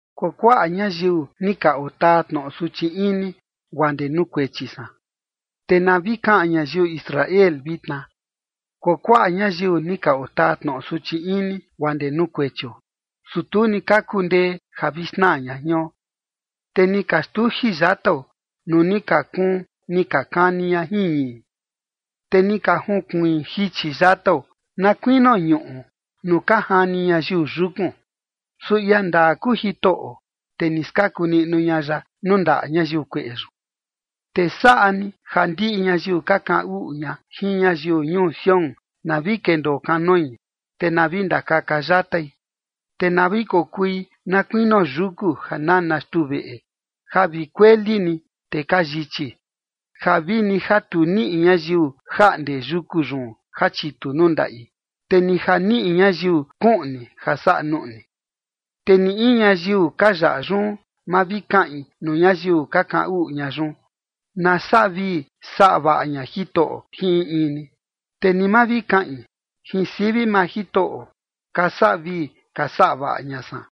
Kuakuaꞌa ñayiu ni ka otaa tnoꞌo suchi ini guaa ndee nuu kuechi san. Te na vi kaꞌan ñayiu Israel vitna: Kuakuaꞌa ñayiu ni ka otaa tnoꞌo suchi ini guaa ndee nuu kuechio. Su tu ni ka kundee ja vi xnaa ña jion. Te ni ka xtuji yatao nuu ni ka kuun ni ka kani ña jin ñii, te ni ka junkuiin jichi yatao, na kuinio ñuꞌu nuu ka jani ñayiu yukun. Su ia ndaa kuu Jitoꞌo, te ni skaku niꞌnu ña ya nuu ndaꞌa ñayiu kueꞌe yun. Te saꞌa ni ja ndiꞌi ñayiu ka kaꞌan uꞌu ña jin ñayiu ñuu Sión, na vi kendoo kanoi, te na vi ndakaka yatai. Te na vi kokui na kuinio yuku ja nana xtuu veꞌe, ja vi kueli ni, te ka yichi, ja vini ja tu niꞌi ñayiu jaꞌnde yuku yun ja chitu nuu ndaꞌi, te ni ja niꞌi ñayiu kuꞌni ja saꞌa nuꞌni. Te ni in ñayiu ka yaꞌa yun, ma vi kaꞌin nuu ñayiu ka kaꞌan uꞌu ña yun: “Na saꞌa vii saꞌa ña Jitoꞌo jin in in ni”. Te ni ma vi kaꞌin: “Jin sivi maa Jitoꞌo ka saꞌa vii ka saꞌa vaꞌa ña san”.